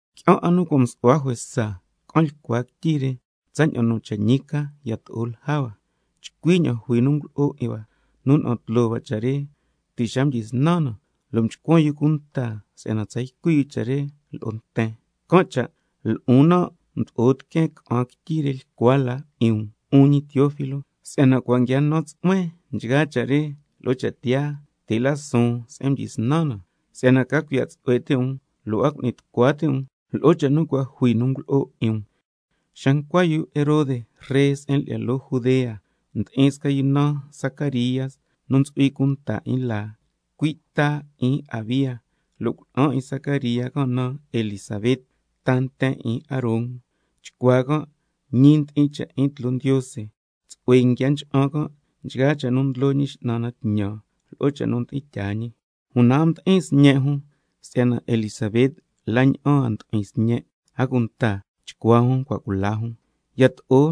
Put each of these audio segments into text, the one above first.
Qui'an 'a nu cua' msu'hua juesa ca'an lyicua quityi re tsaña'an nu cha' ñi ca yato'o lja hua, chcui ña'an jui nu ngulo'o 'in hua, nu na'an tloo cha' re ti' xa mdyisnan na, lo' mchcuan yu cunta si'yana tsa ycui' yu cha' re lo'o nten. Can' cha' lo'on nan' mdo'o tiqueen ca'an quityi re lyicua la 'in um, 'un ñi Teófilo, si'yana cua' nguia nan tsu'huen nchgaa cha' re lo'o cha' tiyaa, ti' la suun se'en mdyisnan na, si'yana ca cuiya' tsu'hue ti' um lo' a cu'ni tucua ti' um lo'o cha' nu cua' jui nu ngulo'o 'in um. Xa ncua yu Herode ree se'en lyi'ya loo Judea, ndi'in sca yu naan Zacaría nu ntsu'hui cunta 'in laa, cui' ta 'in Abía, lo' cuna'an 'in Zacaría can' naan Elisabet, ta nten 'in Aarón. Chcuaa can' ñi ndi'in cha' 'in tloo Ndiose, tsu'hue nguia ncha'an can' nchgaa cha' nu ndlo Ñi X'nan na tñan lo'o cha' nu mdi'in tyaa ñi. Una a mdi'in sñe' jun si'yana Elisabet la' ña'an a mdu'hui sñe', a cunta chcuaa jun cua' cula jun. Yato'o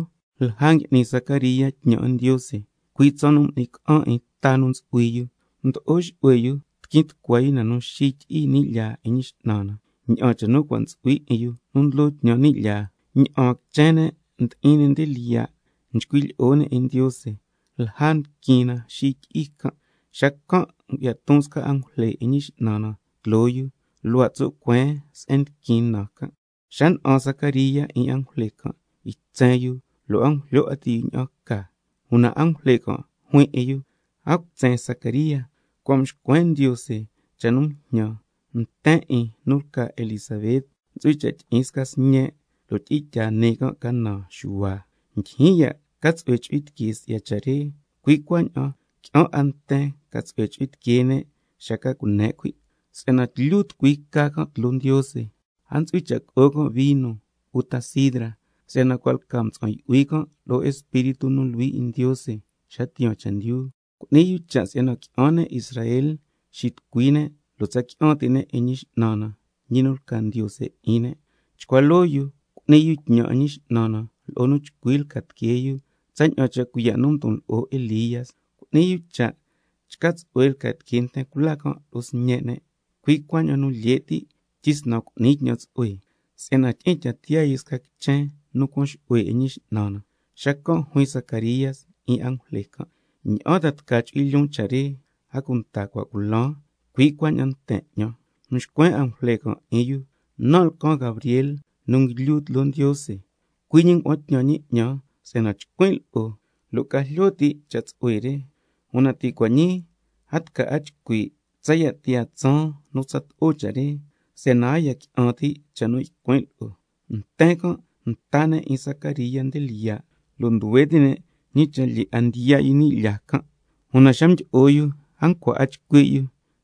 lja ngui'ni Zacaría tñan 'in Ndiose, cui' tsaan nu m'ni ca'an 'in ta nu ntsu'hui yu, mdo'o xu'hue yu tiquin tucua yu na nu xityi'i ni' lyaa 'in Ñi X'nan na, ña'an cha' nu cua' ntsu'hui 'in yu nu ndlo tñan ni' lyaa. Ña'aan quichen ne' ndi'in nde lyiya', nchcui' lyi'o ne' 'in Ndiose lja ndiquin na xityi'i can'. Xacan' ngu'ya ton sca angujle 'in Ñi X'nan na tloo yu, luhua' tso' cueen se'en ndiquin na can'. Xa na'an Zacaría 'in angujle can', ytsen yu lo' a ngujlyo 'a ti' yu ña'an ca. Una angujle can' juin lo'o yu: A cutsen Zacaría, si'yana cua' mxcuen Ndiose cha' nu njñan, nten 'in nu lca Elisabet ntsu'hui cha' tyi'in sca sñe', lo' tyi'in tyaa nii ca naan Xuhua. Ndyijyin ya' ca tsu'hue chu'hui tiquee si'ya cha' re, cui' cuaña'an qui'an 'a nten ca tsu'hue chu'hui tiquee ne' xa ca cune' cuhui', si'yana tlyu tucui ca can' tloo Ndiose. A ntsu'hui cha' co'o can' vino uta sidra, si'yana cua' lca mtsa'an yu'hui can' lo'o Espíritu nu Luhui 'in Ndiose xa tiyaan chendyu. Cu'ni can' cha' si'yana qui'an ne' Israel xitucui ne' lo' tsa qui'an ti' ne' 'in Ñi X'nan na, ñi nu lca Ndiose 'in ne'. Chcua loo yu cu'ni yu tñan 'in Ñi X'nan na lo'o nu chcui lca tiquee yu tsaña'an cha' cuiya' nu mdon lo'o Elía, —cu'ni yu cha' chca tsu'hue lca tiquee nten cula can' lo'o sñe' ne'—, cui' cuaña'an nu lye' ti' tyisnan cu'ni tñan tsu'hue, ña'an ca si'yana tyi'in tya tiyaa yu sca quichen nu cuan xu'hue 'in Ñi X'nan na. Xacan' juin Zacaría 'in angujle can': ¿Ña'an ta tca chu'hui lyoon cha' re? A cunta cua' culan, cui' cuaña'an nten 'ñan. Mxcuen angujle can' 'in yu: Nan' lcan Gabriel nu nguilyu tloo Ndiose, cui' ñi ngua'an tñan ñi 'ñan si'yana chcuin' lo'o lo' ca jlyo ti' cha' tsu'hue re. Una ti' cua' ñii a tca 'a chcui' tsaya' tiyaa tsaan nu tsato'o cha' re, si'yana a ya qui'an ti' cha' nu ycuin' lo'o. Nten can' nta ne' 'in Zacaría nde lyiya', lo' nduhue ti' ne' ñi cha' lyee 'a ndiya' yu ni' lyaa can'. Una xa mdyi'o yu a ncua 'a chcui' yu,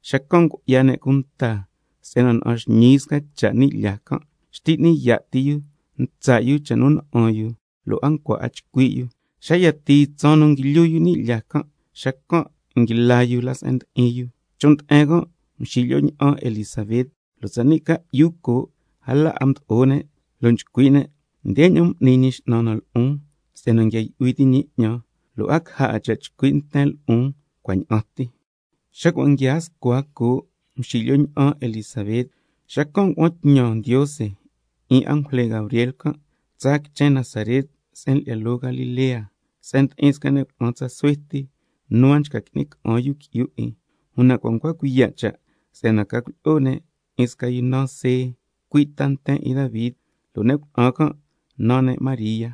xacan' ngu'ya ne' cunta si'yana na'an xñii yu sca cha' ni' lyaa can'. Xtyi n'ni yaa' ti yu ntsa' yu cha' nu na'an yu, lo' a ncua 'a chcui' yu. Xa yatii tsaan nu nguilyu yu ni' lyaa, xacan' nguila yu nde se'en ndi'in yu. Chon' nde'en can' mxilyo ña'an Elisabet, lo' tsani' ca'yu coo' a la 'a mdo'o ne', lo' nchcui' ne': Ndeña'an m'ni Ñi X'nan na lo'on si'yana nguia yu'hui ti' ñi 'ñan, lo' a caja 'a cha' chcui' nten lo'on cua' ña'an ti. Xa cua' nguiaa scua coo' mxilyo ña'an Elisabet, xacan' ngua'an tñan Ndiose 'in angujle Gabriel can', tsaa quichen Nazaret se'en lyi'ya loo Galilea, se'en ndi'in sca ne' cuna'an tsa suhue ti nu a nchca qui'ni ca'an yu qui'yu 'in, una cua' ncua cuiya' cha' si'yana ca cuilyi'o ne' 'in sca yu naan See, cui' ta nten 'in Davi, lo' ne' cuna'an can' naan ne' María.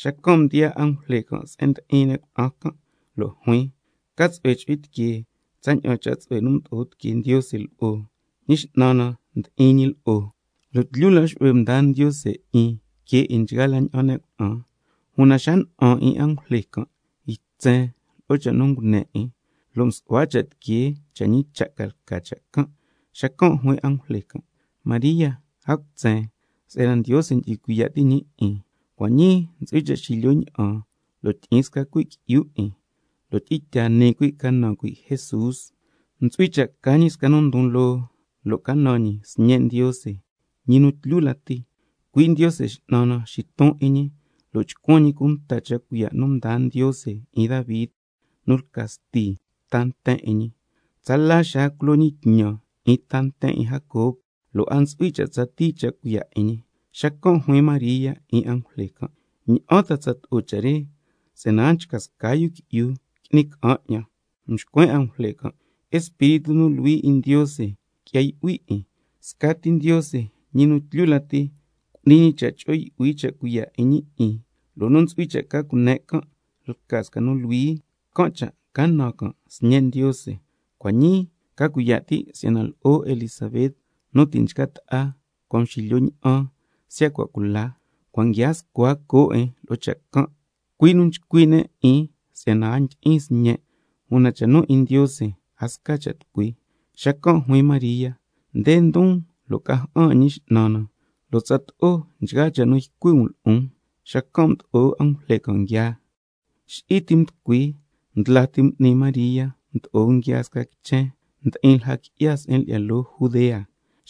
Xacan' mdiyaa angujle se'en ndi'in ne' cuna'an can' lo' juin: ¡Ca tsu'hue chu'hui tiquee tsaña'an cha' tsu'hue nu mdo'o tiquee Ndiose lo'o! Si'yana Ñi X'nan na ndi'in lo'o, lo' tlyu la xu'hue mdaa Ndiose 'in que nchgaa la ña'an ne' cuna'an. Una xa na'an 'in angujle can', ytsen lo'o cha' nu ngune 'in, lo' msu'hua cha' tiquee cha' ñi cha' ca lca cha' can'. Xacan' juin angujle: María, a cutsen, si'yana Ndiose ndyu'hui cuiya' ti' ñi 'in. Cua' ñii ntsu'hui cha' xilyo ña'an lo' tyi'in sca cuhui' qui'yu 'in, lo' tyi'in tyaa nii cuhui' ca naan cuhui' Jesús. Ntsu'hui cha' ca ñi sca nu ndon loo, lo' ca naan ñi Sñe' Ndiose, ñi nu tlyu lati, cui' Ndiose X'nan na xiton 'in ñi, lo' chcuan ñi cunta cha' cuiya' nu mdaa Ndiose 'in Davi, nu lca sti ta nten 'in ñi, tsala xaa culo ñi tñan 'in ta nten 'in Jacob, lo' a ntsu'hui cha' tsatii cha' cuiya' 'in ñi. Xacan' juin María 'in angujle can': ¿Ña'an ta tsato'o cha' re si'yana a nchca sca yu qui'yu qui'ni ca'an 'ñan? Mxcuen angujle can': Espíritu nu Luhui 'in Ndiose qui'ya yu'hui 'in, scati Ndiose ñi nu tlyu lati cu'ni ñi cha' cho'o yu'hui cha' cuiya' 'in ñi 'in, lo' nu ntsu'hui cha' ca cune' can' lca sca nu Luhui, can' cha' ca naan can' Sñe' Ndiose. Cua' ñii ca cuiya' ti' si'yana lo'o Elisabet nu ti' nchca ta'a, cua' mxilyo ña'an siya' cua' cula, cua' nguiaa scua coo' 'in lo'o cha' can', cui' nu nchcui' ne' 'in si'yana a ndyi'in sñe', una cha' nu 'in Ndiose, a sca cha' tucui. Xacan' juin María: Nde ndon lo' ca ja'an 'in Ñi X'nan na, lo' tsato'o nchgaa cha' nu ycui' um lo'on. Xacan' mdo'o angujle can' nguiaa. Xi'i ti mducui, ndla ti m'ni María cha' mdo'o nguiaa sca quichen ndi'in lja qui'ya se'en lyi'ya loo Judea,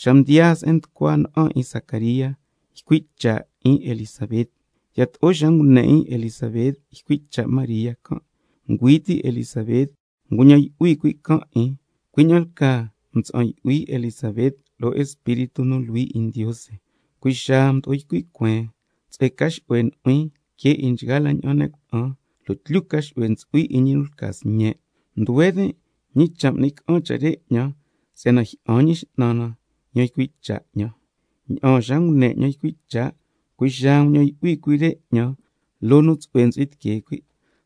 xa mdiyaa se'en nducua na'an 'in Zacaría, ycui' cha' 'in Elisabet. Yato'o xa ngune 'in Elisabet ycui' cha' María can', ngüi ti' Elisabet nguñan yu'hui cuhui' can' 'in, cui' ña'an lcaa mtsa'an yu'hui Elisabet lo'o Espíritu nu Luhui 'in Ndiose. Cui' xaa mdo'o ycui' cueen: Tsu'hue ca xu'hue nu'huin que 'in nchgaa la ña'an ne' cuna'an, lo' tlyu ca xu'hue ntsu'hui 'in ñi nu lca sñe'. Nduhue tin' ñi cha' m'ni ca'an cha' re 'ñan si'yana jyi'an Ñi X'nan yan ycui' cha' 'ñan. Ña'aan xa ngune 'ñan ycui' cha', cui' xaa nguñan yu'hui cuhui' re 'ñan loo nu lyee tsu'hue ntsu'hui tiquee cuhui'.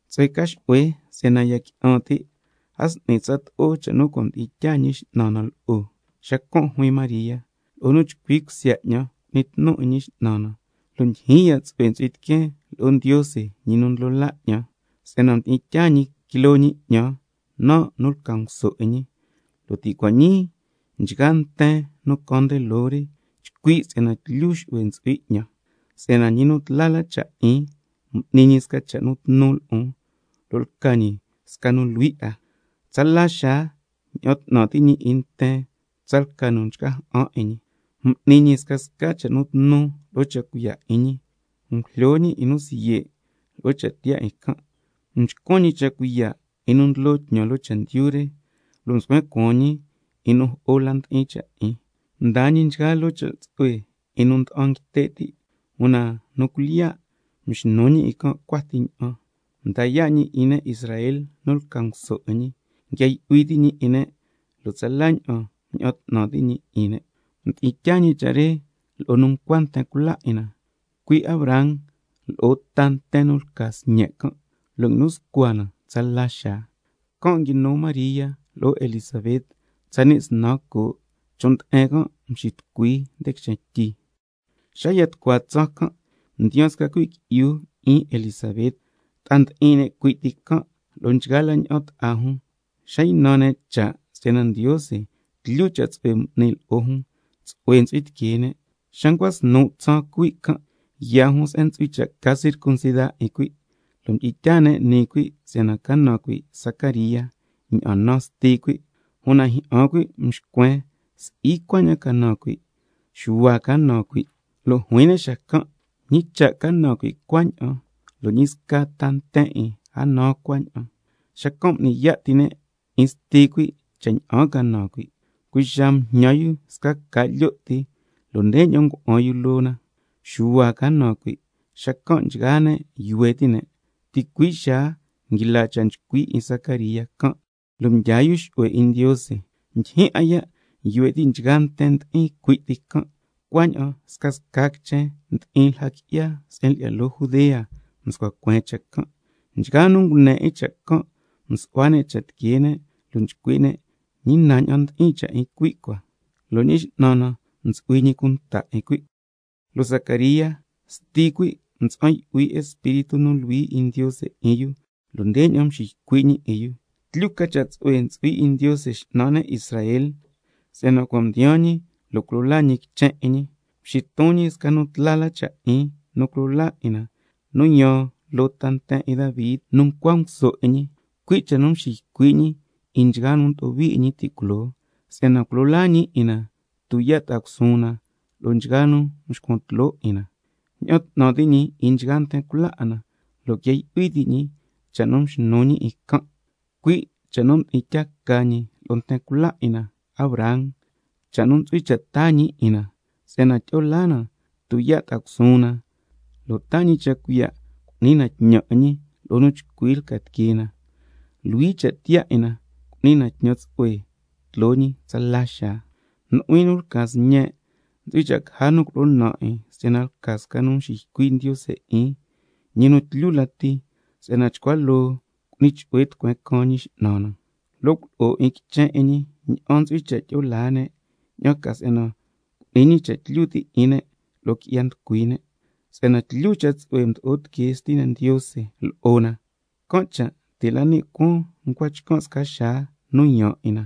Tsu'hue ca xu'hue si'yana ya qui'an ti', a s'ni tsato'o cha' nu cua' mdi'in tyaa Ñi X'nan na lo'o. Xacan' juin María: —Lo'o nu chcui cusya 'ñan cu'nin tnun 'in Ñi X'nan na, lo' ndyijyin ya' tsu'hue ntsu'hui tiqueen lo'o Ndiose, Ñi nu ndlo laa 'ñan, si'yana mdi'in tyaa ñi quiloo ñi 'ñan, nan' nu lca nguso 'in ñi—, lo' ti' cua' ñii nchgaa ta nten nu caan nde loo re, chcui' si'yana tlyu ca xu'hue ntsu'hui 'ñan. Si'yana Ñi nu tla la cha' 'in m'ni ñi sca cha' nu tnu lo'on, —lo' lca ñi sca nu Luhui 'a—. Tsala xaa —ña'an 'tnan ti' ñi 'in nten tsalca nu nchca ja'an 'in ñi—. M'ni ñi scasca cha' nu tnu lo'o cha' cuiya' 'in ñi, ngujlyo ñi 'in nu siye' lo'o cha tiyaa 'in can'. Mchcuan ñi cha' cuiya' 'in nu ndlo tñan loo chendyu re, lo' mscuen cuaan ñi 'in nu jo'o la ndi'in cha' 'in. Mdaa ñi nchgaa loo cha' tsu'hue 'in nu nda'an nguite' ti', una nu cuilyiya' mxnu ñi 'in can' cua ti ña'an. Mda yaa' ñi 'in ne' Israel nu lca nguso 'in ñi, nguia yu'hui ti' ñi 'in ne' lo' tsala ña'an mña'an 'tnan ti' ñi 'in ne', cha' nu mdi'in tyaa ñi lo'o nu ncua nten cula 'in na, cui' Abraham lo'o ta nten nu lca sñe' can', lo' nguinu scua cha' re tsala xaa. Can' nguinu María lo'o Elisabet tsani' snan coo', chon' nde'en can' mxitucui nde quichen tyi. Xa ya tucua tsaan can' mdiyaan sca cuhui' qui'yu 'in Elisabet. Ta'a ndi'in ne' cui' ti can' lo'o nchgaa la ña'an ta'a jun, xa ynan ne' cha' si'yana Ndiose tlyu cha' tsu'hue m'ni ñi lo'o jun, tsu'hue yu'hui tiquee ne'. Xa ncua snu' tsaan cuhui' can', yaa jun se'en ntsu'hui cha' ca circuncida 'in cuhui', lo' mdi'in tyaa ne' nii cuhui' si'yana ca naan cuhui' Zacaría, ña'an naan sti cuhui'. Una jyi'an cuhui' mxcuen: Si'i cuaña'an ca naan cuhui', Xuhua ca naan cuhui'. Lo' juin ne' xacan': ¿Ñi cha' ca naan cuhui' cuaña'an, lo' ñi sca ta nten 'in, a naan cuaña'an? Xacan' m'ni yaa' ti ne' 'in sti cuhui' cha' ña'an ca naan cuhui'. Cui' xaa mjñan yu sca ca' lyo' ti, lo' ndeña'an ngua'an yu loo na: Xuhua ca naan cuhui'. Xacan' nchgaa ne' yuhue ti' ne'. Ticui' xaa nguila cha' nchcui' 'in Zacaría can', lo' mdyaa yu xu'hue 'in Ndiose. Ndyijyin 'a ya' nduhue ti' nchgaa nten ndi'in cui' ti can', cuaña'an scasca quichen ndi'in lja qui'ya se'en lyi'ya loo Judea mscua cueen cha' can'. Nchgaa nu ngune 'in cha' can' msu'hua ne' cha' tiquee ne', lo' nchcui' ne': ¿Ñi na ña'an ndi'in cha' 'in cuhui' cua? Lo' Ñi X'nan na ntsu'hui ñi cunta 'in cuhui'. Lo' Zacaría sti cuhui' mtsa'an yu'hui lo'o Espíritu nu Luhui 'in Ndiose lo' ndeña'an mxiycui' ñi 'in: —Tlyu ca cha' tsu'hue ntsu'hui 'in Ndiose X'nan ne' Israel—, si'yana cua' mdiyaan ñi se'en nu culo laa ñi quichen 'in ñi, mxiton ñi sca nu tla la cha' 'in nu culo laa 'in na, nu yaan loo ta nten 'in Davi nu ncua nguso 'in ñi, cui' tsaña'an cha' nu mxiycui' ñi 'in nchgaa nu mdo'o hui 'in ñi ti' culoo, si'yana culo laa ñi 'in na tuyaa' ta'a cusuun na lo'o nchgaa nu nxcuan tloo 'in na, lo' cuaña'an ña'an 'tnan ti' ñi 'in nchgaa nten cula 'in na, lo' nguia yu'hui ti' ñi cha' nu mxnu ñi 'in can', cui' cha' nu mdi'in tyaa ca ñi lo'o nten cula 'in na Abraham, cha' nu ntsu'hui cha' taa ñi 'in na, si'yana tyi'o laa na tuyaa' ta'a cusuun na, lo' cuaña'an taa ñi cha' cuiya' cu'ni na tñan 'in ñi lo'o nu chcui lca tiquee na, luhui cha' tiyaa 'in na cu'ni na tñan tsu'hue tloo ñi tsala xaa. Nu'huin nu lca sñen', ntsu'hui cha' caja nu culo'o naan 'in si'yana lca yu nu nxiycui' Ndiose 'in, ñi nu tlyu lati. Si'yana —chcua loo lo' cu'ni chu'hue tucueen nu caan Ñi X'nan na—. Lo' culo'o 'in quichen 'in ñi ña'an ntsu'hui cha' tyi'o laa ne', ña'an ca si'yana cu'ni ñi cha' tlyu ti' 'in ne' lo'o qui'ya nducui ne'. Si'yana tlyu cha' tsu'hue mdo'o tiquee Stina Ndiose lo'o na, can' cha' ti' la ni' cuaan ncua chcan' sca xaa nu yaan 'in na,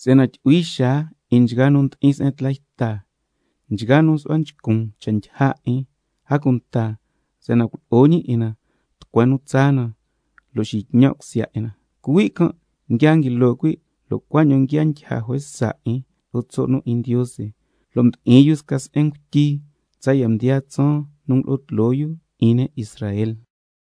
si'yana —tyu'hui xaa 'in nchgaa nu ndi'in se'en tla yta, nchgaa nu nsu'hua nchcun cha' ndyija 'in—, a cunta si'yana culo'o ñi 'in na tucueen nu tsaa na, lo' cuaña'an tca tyi'in tsu'hue na. Cuhui' can' nguia nguilo cuhui', lo' cuaña'an nguia ndyija juesa 'in lo'o tso' nu 'in Ndiose, lo' mdi'in yu sca se'en ngutyi tsaya' mdiyaa tsaan nu ngulo'o tloo yu 'in ne' Israel.